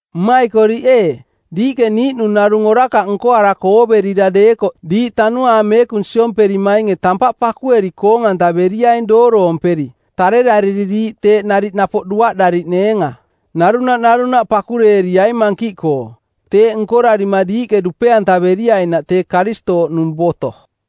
Mmaikoriꞌ ee, diiꞌke niiꞌnung narung orakaꞌ nkoarako ooverira deekoꞌ diiꞌ Tanuaang Meekung siomperimainge tampaꞌ pakueri koong-antaveriaing dooroomperi, tarerariri diiꞌ teeꞌ nariꞌ napoꞌ duaꞌdariꞌneenga. Narunaꞌ narunaꞌ pakureeriai mankiꞌkoo. Teeꞌ nkorarima diiꞌke dupe-antaveriainaꞌ tee Karistooꞌnung boto.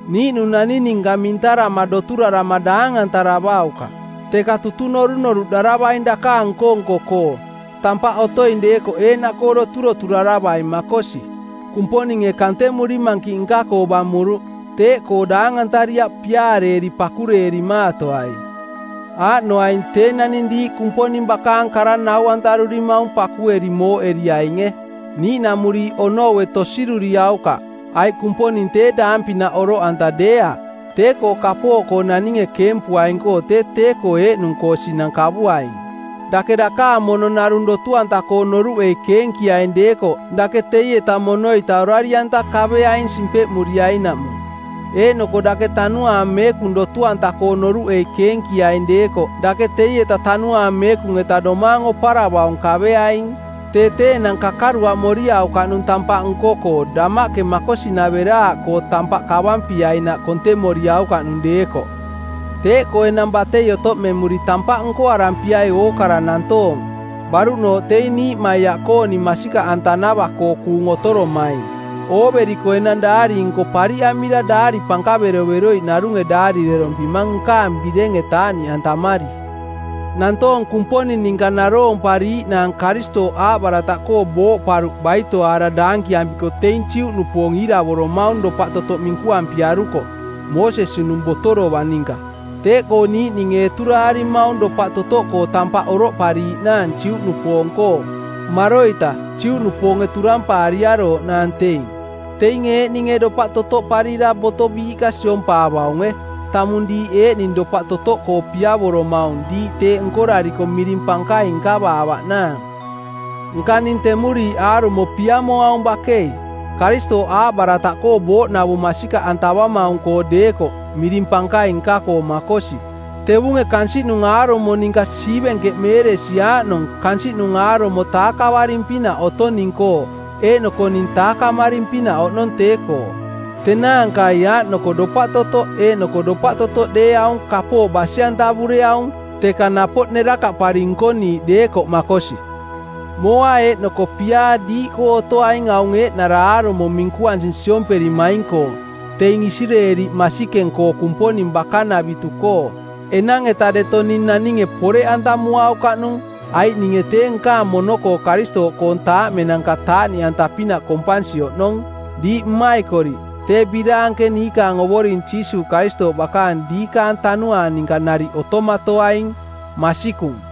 Niiꞌnung naning ninka mintarama doturarama daangantaravaukaꞌ, teka tutung norunoruꞌdaravaing dakaang nko-nko-koo, tampaꞌ otoing deekoꞌ eeꞌnaꞌkoo doturoturaravai makosi. Kumponinge kantemuri mankiꞌ nka-koo bamuruꞌ. Teeꞌkoo daangantariaꞌ piaareeri pakureerimaatoai. Aaꞌnoaing tee naning diiꞌ Kumponing bakaang kara nau-antarurimaung pakueri mooꞌeriainge. Niiꞌnamuriiꞌ onoue tosiruriaukaꞌ, aiꞌ Kumponing tee daang-pinaꞌ oroꞌanta deeaꞌ. Tee-koo kapooꞌkoo naninge keempuaing-koo tee tee-koo eeꞌnung-koo sinang kavuaing. Dake dakaang mono narung dotu-anta-koo noruꞌei keenkiaing deekoꞌ dake teieta mono-ita orari-anta kaveaing simpeꞌmuriainaꞌmung. Eeꞌnoko dake Tanuaang Meekung dotu-anta-koo noruꞌei keenkiaing deekoꞌ dake teieta Tanuaang Meekung-eta domaang oparavaung kaveaing. Tee tee enang kakaruaꞌmoriaukaꞌnung tampaꞌ nko-koo damaꞌke makosinaveraaꞌkoo tampaꞌ kavampiainaꞌ kontemoriaukaꞌnung deekoꞌ. Teeꞌkoo enang batei otoꞌmemuri tampaꞌ nkoarampiai ookara nantoong, baruꞌnooꞌ teing niiꞌmaiaꞌkooning masikaꞌantanava-koo kuung otoromaing. Ooveriko enang daari-nko pariꞌamira daari pankaveroveroiꞌ narunge daarirerompimang nkaang birenge taaꞌniꞌantamari. Nantoong Kumponing ninka naroompariiꞌnaang Karistooꞌ aaꞌbarataꞌkoo booꞌparuꞌ baitoaara daankiampiko teing Juꞌnupoong iiravoromaung dopaꞌtotoꞌ minkuampiaruko, Moosesi-nung boto dovang ninka. Teeꞌkoo niiꞌninge eturaarimaung dopaꞌ totoꞌkoo tampaꞌ oroꞌpariiꞌ naang Juꞌnupoong-koo. Maroita, Juꞌnupoonge turampaariarooꞌnaang teing. Teinge eeꞌninge dopaꞌ totoꞌparira boto biiꞌka siompaavaunge, tamung diiꞌ eeꞌning dopaꞌ totoꞌkoo piavoromaung diiꞌ teeꞌ nkorariko miring pankaing nkavaavaꞌnaang. Nka ning temuriiꞌ aarumo piamoaung bakei, Karistooꞌ aaꞌbarataꞌkoo booꞌnavung masikaꞌantavamaung-koo deekoꞌ, miring pankaing nka-koo makosi. Tevunge kansiꞌnung aarumo ninka siivenkeꞌmeeresi aaꞌnong kansiꞌnung aarumo taakavaring-pinaꞌ otong ning-koo eeꞌnoko ning taakamaring-pinaꞌ oꞌnong tee-koo. Tenaankai aaꞌnoko dopaꞌ totoꞌ eeꞌnoko dopaꞌ totoꞌ deeaung kapooꞌ basi-antavureaung, teka napoꞌ nerakaꞌpari nkoniiꞌke deekoꞌ makosi. Mooa eeꞌnoko piaa diiꞌkoo otoaing aung eeꞌnara aarumo minkuansinung siomperimaing-koo, teing Isireeli masikeng-koo Kumponing bakanavitu-koo. Enang-eta deto ning naninge poreꞌantamuaukaꞌnung, aiꞌ ninge tee nkaang mono-koo Karistooꞌkoong taaꞌmenanka taaꞌniꞌanta-pinaꞌ kompansi oꞌnong. Diiꞌ mmaikoriꞌ, tee biraanke niikaang Ovoring Jiisuuꞌ Karistooꞌ bakaang diikaang tanuaang ninka nariꞌ otomatoaing. Masikung.